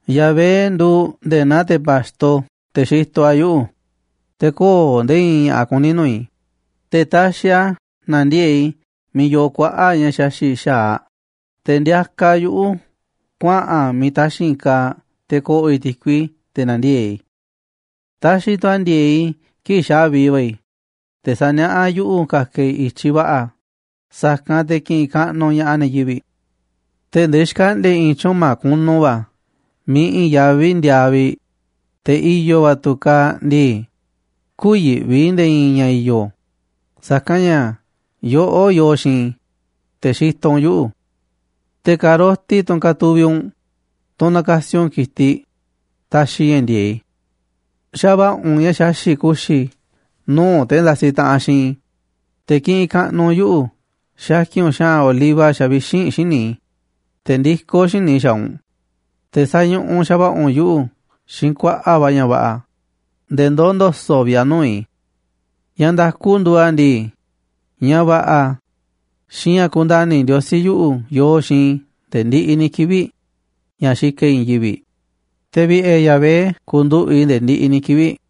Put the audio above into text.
Yahvé nduuꞌ nde̱e̱ naa te̱ pa̱xto, te̱ xitoꞌ a̱ yuꞌu̱, te̱ köo̱ꞌ nde̱e̱ i̱i̱n ña̱ꞌa̱ kuní nuu̱ꞌ i̱. Te̱ taxiꞌ a̱ nandiee̱ꞌ i̱ miiꞌ yoo kuaꞌa̱ꞌ ña̱ xaxi̱ꞌ xa̱aꞌ, te̱ ndiakaꞌ a̱ yuꞌu̱ kuaꞌa̱n a̱ yivi̱ miiꞌ taxi̱nꞌ kaaꞌ te̱ ko̱ꞌo̱ i̱ ti̱kui, te̱ na̱ndiee̱ꞌ i̱. Taxiꞌ tu̱ a̱ ndi̱e̱e̱ꞌ i̱ kii̱ꞌ xa̱vi va̱ i̱, te̱ saniaꞌá a̱ yuꞌu̱ ka̱ka̱ i̱ i̱tyiꞌ va̱ꞌa̱, sa̱kanꞌ te̱ kiꞌinꞌ kaꞌnuꞌ ña̱ꞌaꞌ ne̱ yivi̱ꞌ. Tee̱ꞌ ndee xkaꞌndi̱a̱ i̱ i̱i̱n tyuꞌma̱ kunu va̱ miiꞌ i̱i̱n yaví ndiaa vi̱ꞌ, te̱ i̱yo̱ va̱ tu̱ kaaꞌ ndii, kü̱yi̱ꞌvi i̱ nde̱e̱ i̱i̱n ña̱ i̱yo̱, sa̱kanꞌ ña̱ yoꞌó yoo xiinꞌ i̱, te̱ xitoꞌ u̱nꞌ yuꞌu̱. Te̱ ka̱roti, tunꞌ katuviꞌ u̱nꞌ, tunꞌ nakasi u̱nꞌ ki̱tiꞌ, taxiꞌ ña̱ ndi̱e̱eꞌ i̱. Xa̱va̱ꞌa̱ u̱nꞌ ña̱ xaxi̱ꞌ ku̱xi̱ i̱ nuu̱ꞌ te̱ ndasiꞌ taꞌanꞌ xiinꞌ i̱, te̱ kiꞌinꞌ kaꞌnuꞌ u̱nꞌ yuꞌu̱ xakin u̱nꞌ xa̱ꞌa̱n oliva xavixínꞌ xíniꞌ i̱, te̱ ndikó xíniꞌ i̱ xaaꞌ u̱nꞌ, te̱ sañuꞌuꞌ xa̱va̱ꞌa̱ u̱nꞌ yuꞌu̱ xiinꞌ kuaꞌa̱ꞌ va̱ ña̱ va̱ꞌa̱ nde̱e̱ ndoó ndo̱so̱ꞌ vi̱ꞌ a̱ nu̱uꞌ i̱. Ña̱ nda̱ku nduuꞌ a̱ ndii, ña̱ va̱ꞌa̱ xiinꞌ ña̱ kundani̱ Ndiosí yuꞌu̱ yooꞌ xiinꞌ i̱ nde̱e̱ ndiꞌiꞌ ni̱ kivi̱ꞌ ña̱ xikaꞌ i̱ i̱i̱n yivi̱ꞌ, te̱ vi̱ꞌe̱ Yahvé ku̱nduꞌu̱ꞌ i̱ nde̱e̱ ndiꞌiꞌ ni̱ kivi̱ꞌ.